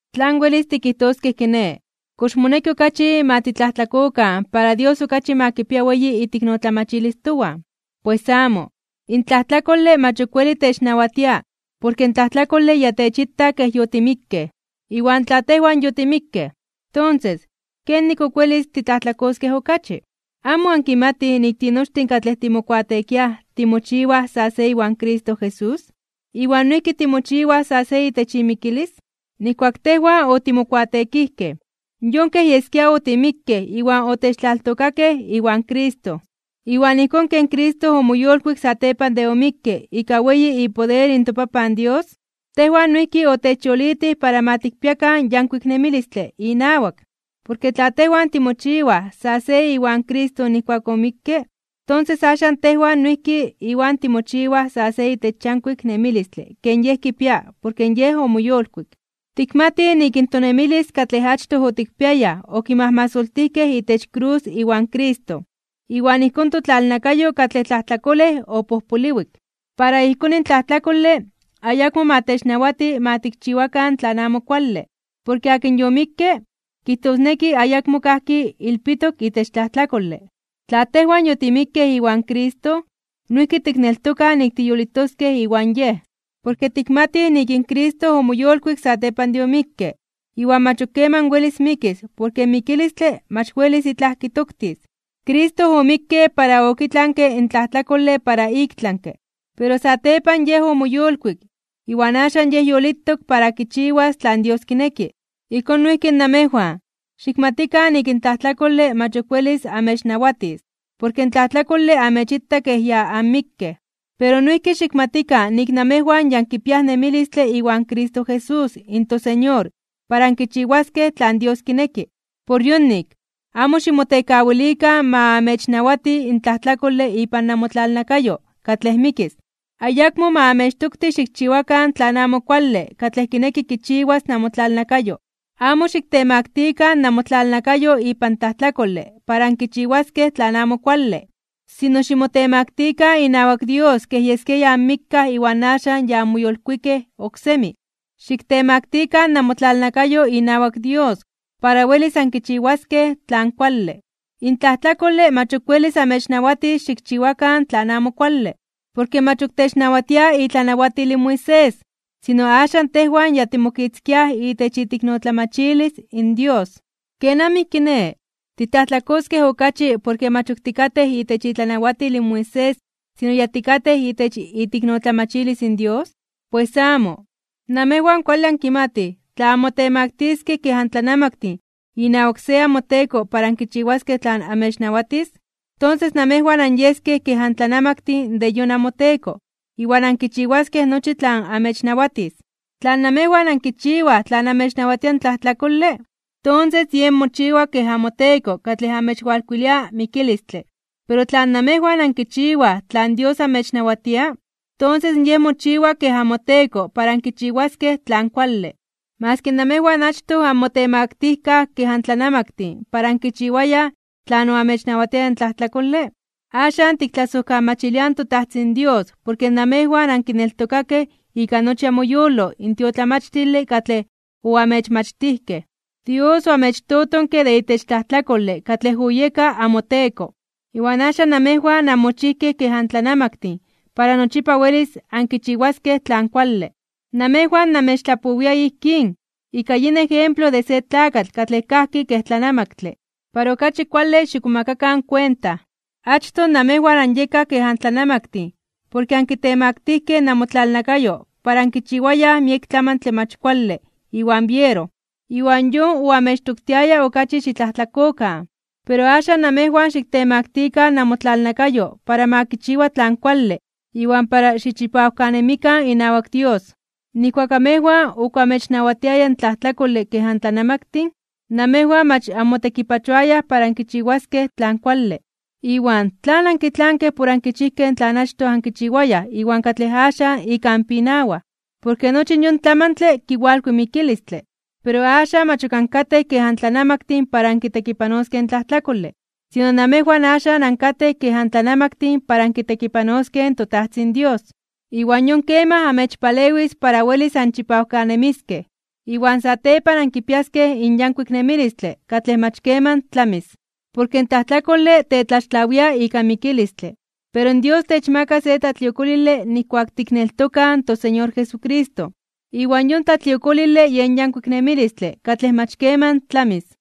¿Tlan welis tikijtoskej kiné? ¿Kox moneki okachi ma titlajtlakokan para Dios okachi ma kipia weyi iteiknotlamachilis towan? ¡Pues amo! In tlajtlakole mach ok weli technawatia porke in tlajtlakole ya techita kej yotimikkej. Iwan tla tejwan yotimikkej, tonses ¿kenik ok welis titlajtlakojtoskej okachi? ¿Amo ankimatij nik tinochtin katlej timokuateekiaj timochiwaj sa se iwan Cristo Jesús, iwan noijki timochiwaj sa se itech imikilis? Nijkuak tejwan otimokuateekijkej, yon kej yeskia otimikkej iwan otechtlaltokakej iwan Cristo. Iwan ijkón ken Cristo omoyolkuik satepan de omikke ika weyi ipoder in toPapan Dios, tejwan noijki otechyolitij para ma tikpiakan yankuik nemilistle inawak. Porke tla tejwan timochiwaj sa se iwan Cristo nijkuak omikke, tonses axan tejwan noijki Iwan timochiwaj sa se itech yankuik nemilistle ken Yej kipia porke Yej omoyolkuik. Tikmatij nik in tonemilis katlej achtoj otikpiayaj okimajmasoltijkej itech krus iwan Cristo, iwan ijkón totlalnakayo katlej tlajtlakolej opojpoliwik. Para ijkón in tlajtlakole ayakmo ma technawati ma tikchiwakan tlan amo kuale. Porke akin yomikke, kijtosneki ayakmo kajki ilpitok itech tlajtlakole. Tla tejwan yotimikkej iwan Cristo, noijki tikneltokaj nik tiyolitoskej iwan Yej. Porke tikmatij nik in Cristo omoyolkuik satepan de omikke iwan mach ok keman welis mikis porke in mikilistle mach welis itlaj kitoktis. Cristo omikke para okitlanke in tlajtlakole para iktlanke (ik tlami). Pero satepan Yej omoyolkuik, iwan axan Yej yolitok para kichiwas tlan Dios kineki. Ijkón noijki namejwan, xikmatikan nik in tlajtlakole mach ok welis amechnawatis porke in tlajtlakole amechita kej ya anmikkej. Pero noijki xikmatikan nik namejwan ya ankipiaj nemilistle iwan Cristo Jesús in toSeñor para ankichiwaskej tlan Dios kineki. Por yonik, amo ximotekawilikan ma amechnawati in tlajtlakole ipan namotlalnakayo katlej mikis. Ayakmo ma amechtokti xikchiwakan tlan amo kuale katlej kineki kichiwas namotlalnakayo. Amo xiktemaktikan (xiktemaktilikan) namotlalnakayo ipan tlajtlakole para ankichiwaskej tlan amo kuale. Sino ximotemaktikan inawak Dios kej yeskia ya anmikkaj iwan axan ya anmoyolkuikej oksemi. Xiktemaktikan namotlalnakayo inawak Dios para welis ankichiwaskej tlan kuale. In tlajtlakole mach ok welis amechnawatis xikchiwakan tlan amo kuale, porke mach ok technawatia itlanawatil in Moisés, sino axan tejwan ya timokitzkiaj itech iteiknotlamachilis in Dios. ¿Kenamij kiné? ¿Titlajtlakoskej okachi porke mach ok tikatej itech itlanawatil in Moisés sino ya tikatej itech iteiknotlamachilis in Dios? ¡Pues amo! Namejwan kuale ankimatij tla anmotemaktiskej (onmotemaktiliskej) kej antlanamaktin inawak se amoteko para ankichiwaskej tlan amechnawatis, tonses namejwan anyeskej kej antlanamaktin de yon amoteko iwan ankichiwaskej nochi tlan amechnawatis. Tla namejwan ankichiwaj tlan amechnawatia in tlajtlakole, tonses yen mochiwaj kej amoteko katlej amechwalkuilia mikilistle. Pero tla namejwan ankichiwaj tlan Dios amechnawatia, tonses Yej mochiwa kej amoteko para ankichiwaskej tlan kuale. Maski namejwan achtoj anmotemaktijkaj (onmotemaktilijkaj) kej antlanamaktin para ankichiwayaj tlan oamechnawatiaya in tlajtlakole, axan tiktlasojkamachiliaj in toTajtzin Dios porke namejwan ankineltokakej ika nochi amoyolo in tiotlamachtile katlej oamechmachtijkej. Dios oamechtotonke de itech tlajtlakole katlej oyeka amoteko, iwan axan namejwan anmochijkej kej antlanamaktin para nochipa welis ankichiwaskej tlan kuale. Namejwan namechtlapowia ijkín, ika yin ejemplo de se tlakatl katlej kajki kej tlanamaktle, para okachi kuale xikmomakakan kuenta. Achtoj namejwan anyekaj kej antlanamaktin porke ankitemaktijkej (onkitemaktilijkej) namotlalnakayo para ankichiwayaj miek tlamantle mach kuale iwan biero. Iwan yon oamechtoktiaya okachi xitlajtlakokan, pero axan namejwan xiktemakakan namotlalnakayo para ma kichiwa tlan kuale iwan para xichipawkanemikan inawak Dios. Nijkuak amejwan ok oamechnawatiaya in tlajtlakole kej antlanamaktin, namejwan mach anmotekipachoayaj para ankichiwaskej tlan kuale. Iwan ¿tlan ankitlankej por ankichijkej tlan achtoj ankichiwayaj iwan katlej axan ika anpinawaj? Porke nochi yon tlamantle kiwalkui mikilistle. Pero axan, mach ok ankatej kej antlanamaktin para ankitekipanoskej in tlajtlakole, sino namejwan axan ankatej kej antlanamaktin para ankitekipanoskej in toTajtzin Dios. Iwan yon kemaj amechpalewis para welis anchipawkanemiskej, iwan satepan ankipiaskej in yankuik nemilistle katlej mach keman tlamis. Porke in tlajtlakole tetlaxtlawia ika mikilistle, pero Dios techmaka se tlatliokolile nijkuak tikneltokaj in toSeñor Jesucristo, iwan yon tlatliokolile yen yankuik nemilistle katlej mach keman tlamis.